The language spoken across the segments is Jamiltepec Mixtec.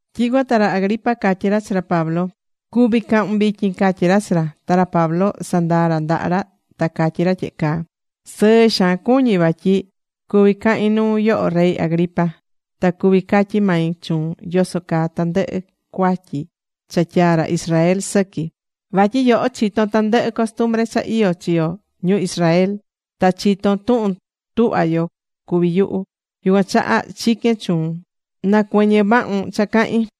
Tyicuan ta ra Agripa catyí ra chi ra Pablo: ―Cuví cahun vityin ―catyí ra chi ra. Ta ra Pablo sandaa̱ ra ndaha ra ta catyí ra tyehe caa: ―Sɨɨ xaan cuñí vatyi cuví cahin nuu yoho, rey Agripa, ta cuví catyí mai chuun yoso caa tandɨhɨ cuatyi cha tyaá ra Israel sɨqui. Vatyi, yoho chitón tandɨhɨ costumbre cha iyó chi yo ñu Israel. Ta chitón tuhun tuhva yo cuvi yuhu. Yucuan chaha chiquén chuun nacuɨñɨ vahun cha cahín.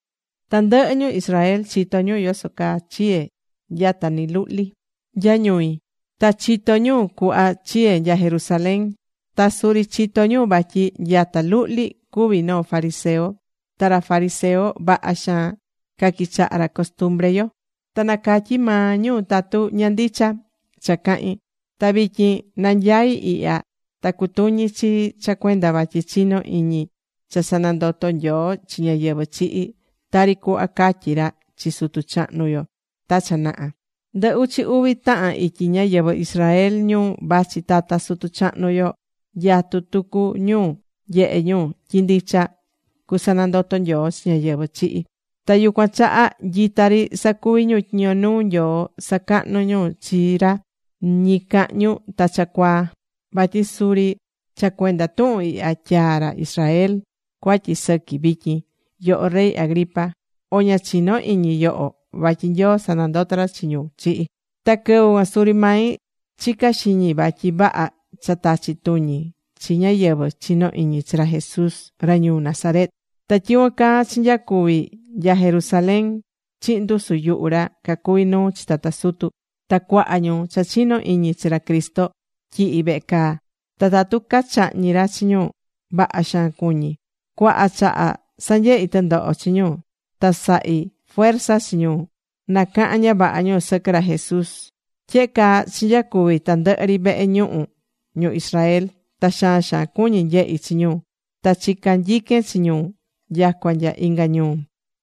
’Tandɨhɨ ñu Israel chitó ñu yoso caa chiye̱ nyata ni luhli nya ñui. Ta chitó ñu cuhva chiye̱ nya Jerusalén. Ta suri chitó ñu vatyi nyata luhli cuví noo fariseo. Ta ra fariseo vaha xaan caquichahá ra costumbre yo. Ta na catyi maa ñu tatu ña ndicha cha cahín. Ta vityin nanyaí ihya ta cutuñi chii cha cuenda vatyi chinó iñi cha sanandotó Nyoo chi ñáyɨvɨ chihi̱, tari cuhva catyí ra chi sutu chahnu yo ta cha naha. Ndɨ uchi uvi tahan ityi ñáyɨvɨ Israel ñu vachi tata sutu chahnu yo nyatú tucu ñu nyehe ñu tyi ndicha cusanandoto Nyoo chi ñáyɨvɨ chihi̱. Ta yucuan chaha nyita ri sacuví ñu tyiño nuu Nyoo sacahnu ñu chi ra ñicahñu ta cha cuaa. Vatyi suri cha cuenda tuhun ihya tyaá ra Israel cuatyi sɨqui vityin, yoho rey Agripa. ¿O ña chinó iñi nyoho vatyi Nyoo sanandotó ra chi ñu chihi̱? ’Ta quɨvɨ cuan suri mai chica̱ xiñi vatyi vaha cha tachi tuñi chi ñáyɨvɨ chinó iñi chi ra Jesús ra ñuu Nazaret. Ta tyicuan caa chinyacuvi̱ nya Jerusalén chihin ndusu yuhu ra cacuví nuu chi tata sutu. Ta cuaha ñu cha chinó iñi chi ra Cristo tyihi̱ vehe caa. Ta tatu cachahñi̱ ra chi ñu, vaha xaan cuñi̱. Cuaha chaha sanyehi̱ tɨndoho chi ñu ta sahi̱ fuerza chi ñu nacahan ña vaha ñu sɨquɨ ra Jesús. Tyehe caa chinyacuvi̱ tandɨhɨ ri vehe ñuhu ñu Israel. Ta xaan xaan cuñi̱ nyehi chi ñu. Ta chica̱ nyiquen chi ñu nyacua nya inga ñuu.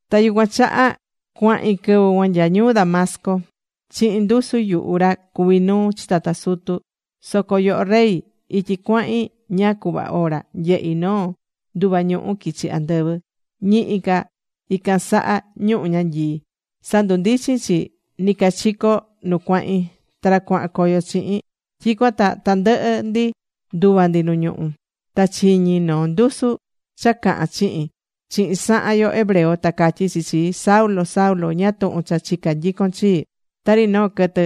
’Ta yucuan chaha cuahi̱n quɨvɨ cuan nya ñuu Damasco chihin ndusu yuhu ra cuví nuu chi tata sutu. Soco yoho Rey, ityi cuahin ñáá cuhva ora, nyehi̱ noo nduva ñuhu quichi̱ andɨvɨ, ñihi ca ican saha ñuhu ñanyii. Sandundichi̱n chi nicachico nu cuahin ta ra cuahan coyo chihin. Tyicuan ta tandɨhɨ ndi nduva̱ ndi nu ñuhú. Ta chiñi̱ noo ndusu cha cahán chihin, chihin sahan yo hebreo, ta catyí chi chii: “Saulo, Saulo, ¿ñáá tuhun cha chicá nyicon chii? Tari noo quɨtɨ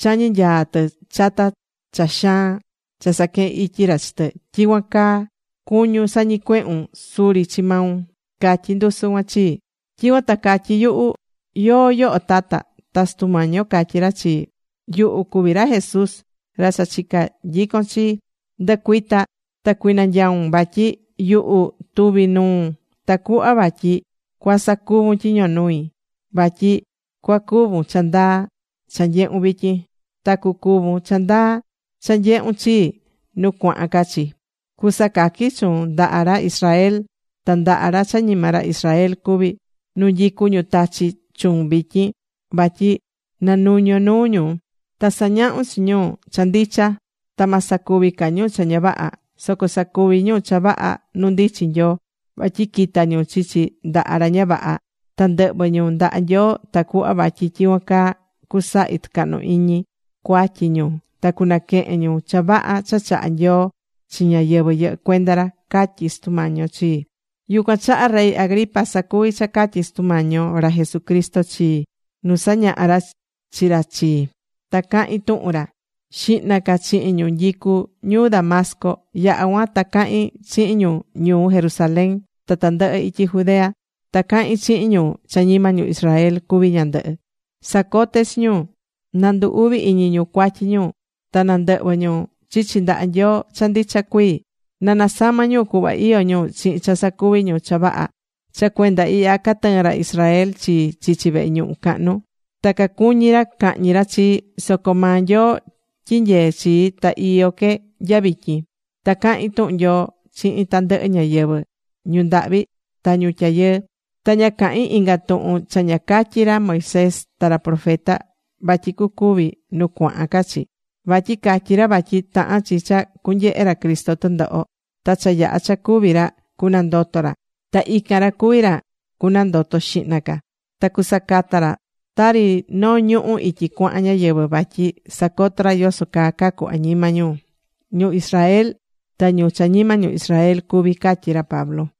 chañí nyaa tɨ chata cha xaan cha saquehén ityi ra chi tɨ, tyicuan caa cuñún sañicuehun suri chi maun”, catyí ndusu cuan chii. Tyicuan ta catyí yuhu: “¿Yóó yoho tata?” Ta Sutu Mañi yo catyí ra chii: “Yuhu cuví ra Jesús, ra cha chicá nyicon chi. Ndɨ̱cuita ta cui̱nanyaun, vatyi yuhu tuví nuun tacuhva vatyi cuasacuvun tyiño nui, vatyi cuacuvun cha ndaa cha nyehu̱n vityin. Ta cucuvun cha ndaa cha nyehun chii nu cuahan ca chi. Cusacaqui chuun ndaha ra Israel, ta ndaha ra cha ñima ra Israel cuví. Nu nyicú ñu tachí chuun vityin. Vatyi na nu̱ñon nuu ñu, ta sa̱ñahun chi ñu cha ndicha, ta ma sacuvi ca ñu cha ña vaha. Soco sacuvi ñu cha vaha nu ndichin Nyoo vatyi quita̱ ñu chichi ndaha ra ña vaha ta ndɨhvɨ ñu ndaha Nyoo tacuhva vatyi tyicuan caa cusahi tɨcahnu iñi cuatyi ñu ta cunaquehen ñu cha vaha cha chahá Nyoo chi ñáyɨvɨ yɨhɨ́ cuenda ra”, catyí Sutu Mañi yo chii. ’Yucuan chaha rey Agripa, sacuví cha catyi̱ Sutu Mañi yo ra Jesucristo chii nu sañaha̱ ra chi ra chii. Ta cahi̱n tuhun ra xihna ca chihin ñu nyicu ñuu Damasco. Yaha̱ cuan ta cahi̱n chihin ñu ñuu Jerusalén ta tandɨhɨ ityi Judea. Ta cahín chihin ñu cha ñima ñu Israel cuví ñandɨhɨ. Sacote̱ chi ñu nandu uvi iñi ñu cuatyi ñu, ta nandɨhvɨ ñu chichi ndaha Nyoo cha ndicha cuii. Na nasama̱ ñu cuhva iyó ñu chihin cha sacuvi ñu cha vaha. Cha cuenda ihya catɨɨ̱n ra Israel chii chichi vehe ñuhu cahnu. Ta cacuñi ra cahñi ra chii. Soco maa Nyoo tyinyeé chii. Ta iyó que nya vityin. Ta cahín tuhun Nyoo chihin tandɨhɨ ñáyɨvɨ, ñu ndahvi ta ñu tyayɨɨ. Ta ña cahín inga tuhun cha ña catyi̱ ra Moisés ta ra profeta, vatyi cucuvi nu cuahan ca chi. Vatyi catyi̱ ra vatyi tahán chi cha cunyehe ra Cristo tɨndoho. Ta cha yaha̱ cha cúvi ra, cunandoto ra. Ta ican ra cuví ra cunandoto xihna ca. Ta cusacata ra tari noo ñuhu̱ ityi cuahan ñáyɨvɨ vatyi sacotó ra yoso caa cacu añima ñu, ñu Israel ta ñu cha ñima ñu Israel cuví ―catyí ra Pablo.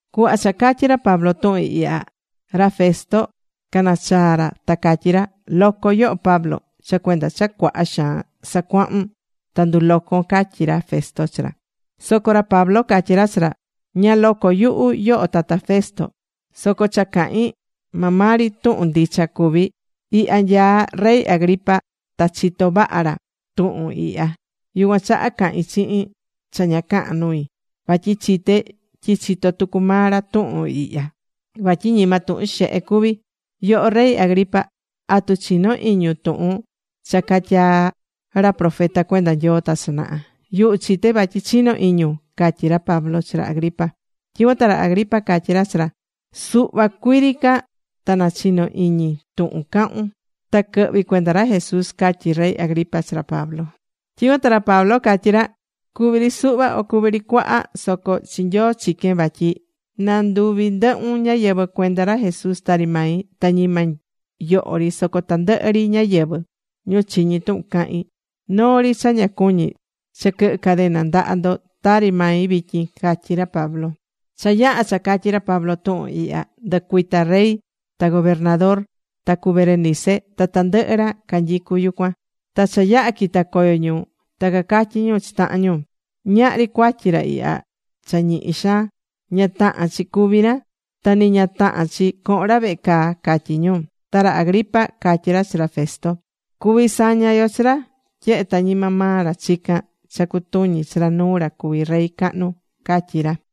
Cuhva cha catyi̱ ra Pablo tuhun ihya, ra Festo canachaa̱ ra, ta catyí ra: ―¡Loco yoho Pablo! cha cuenda cha cuaha xaan sacuahún ta ndulocon ―catyí ra Festo chi ra. Soco ra Pablo catyí ra chi ra: ―Ña loco yuhu, yoho tata Festo. Soco cha cahín, maa maa ri tuhun ndicha cuví. Ihya nyaá rey Agripa. Ta chitó vaha ra tuhun ihya. Yucuan chaha cahín chihin cha ña cahán nui. Vatyi chité tyi chitó tucu maa ra tuhun ihya, vatyi ñima tuhun xehe cuví. Yoho rey Agripa, ¿atu chinó iñun tuhun cha catyaa̱ ra profeta cuenda Nyoo ta cha naha? Yuhu chité vatyi chinó iñun ―catyí ra Pablo chi ra Agripa. Tyicuan ta ra Agripa catyí ra chi ra: ―Suhva cuii ri ca ta nachino iñi tuhun cahun ta quɨhvi cuenda ra Jesús ―catyí rey Agripa chi ra Pablo. Tyicuan ta ra Pablo catyí ra: ―Cuví ri suhva, o cuví ri cuaha soco chi Nyoo chiquén vatyi na nduvi ndɨhun ñáyɨvɨ cuenda ra Jesús tari mai. Ta ñima yoho ri, soco tandɨhɨ ri ñáyɨvɨ, ñu chiñí tuhun cahín. Noo ri cha ña cuñí, cha quɨhɨ cadena ndaha ndo tari mai vityin ―catyí ra Pablo. Cha yaha̱ cha catyi̱ ra Pablo tuhun ihya, ndɨcuita̱ rey ta gobernador ta cu Berenice, ta tandɨhɨ ra canyicú yucuan. Ta cha yaha̱ quita coyo ñu, ta cacatyí ñu chi tahan ñu: ―Ñahri cuatyi ra ihya cha ñihi xaan. Ña tahán chi cúvi ra. Ta ni ña tahán chi cohon ra vehe caa ―catyí ñu. Ta ra Agripa catyí ra chi ra Festo: ―Cuví saña yo chi ra, tyehe ta ñima maa ra chicán cha cutuñi chi ra nuu ra cuví rey cahnu ―catyí ra.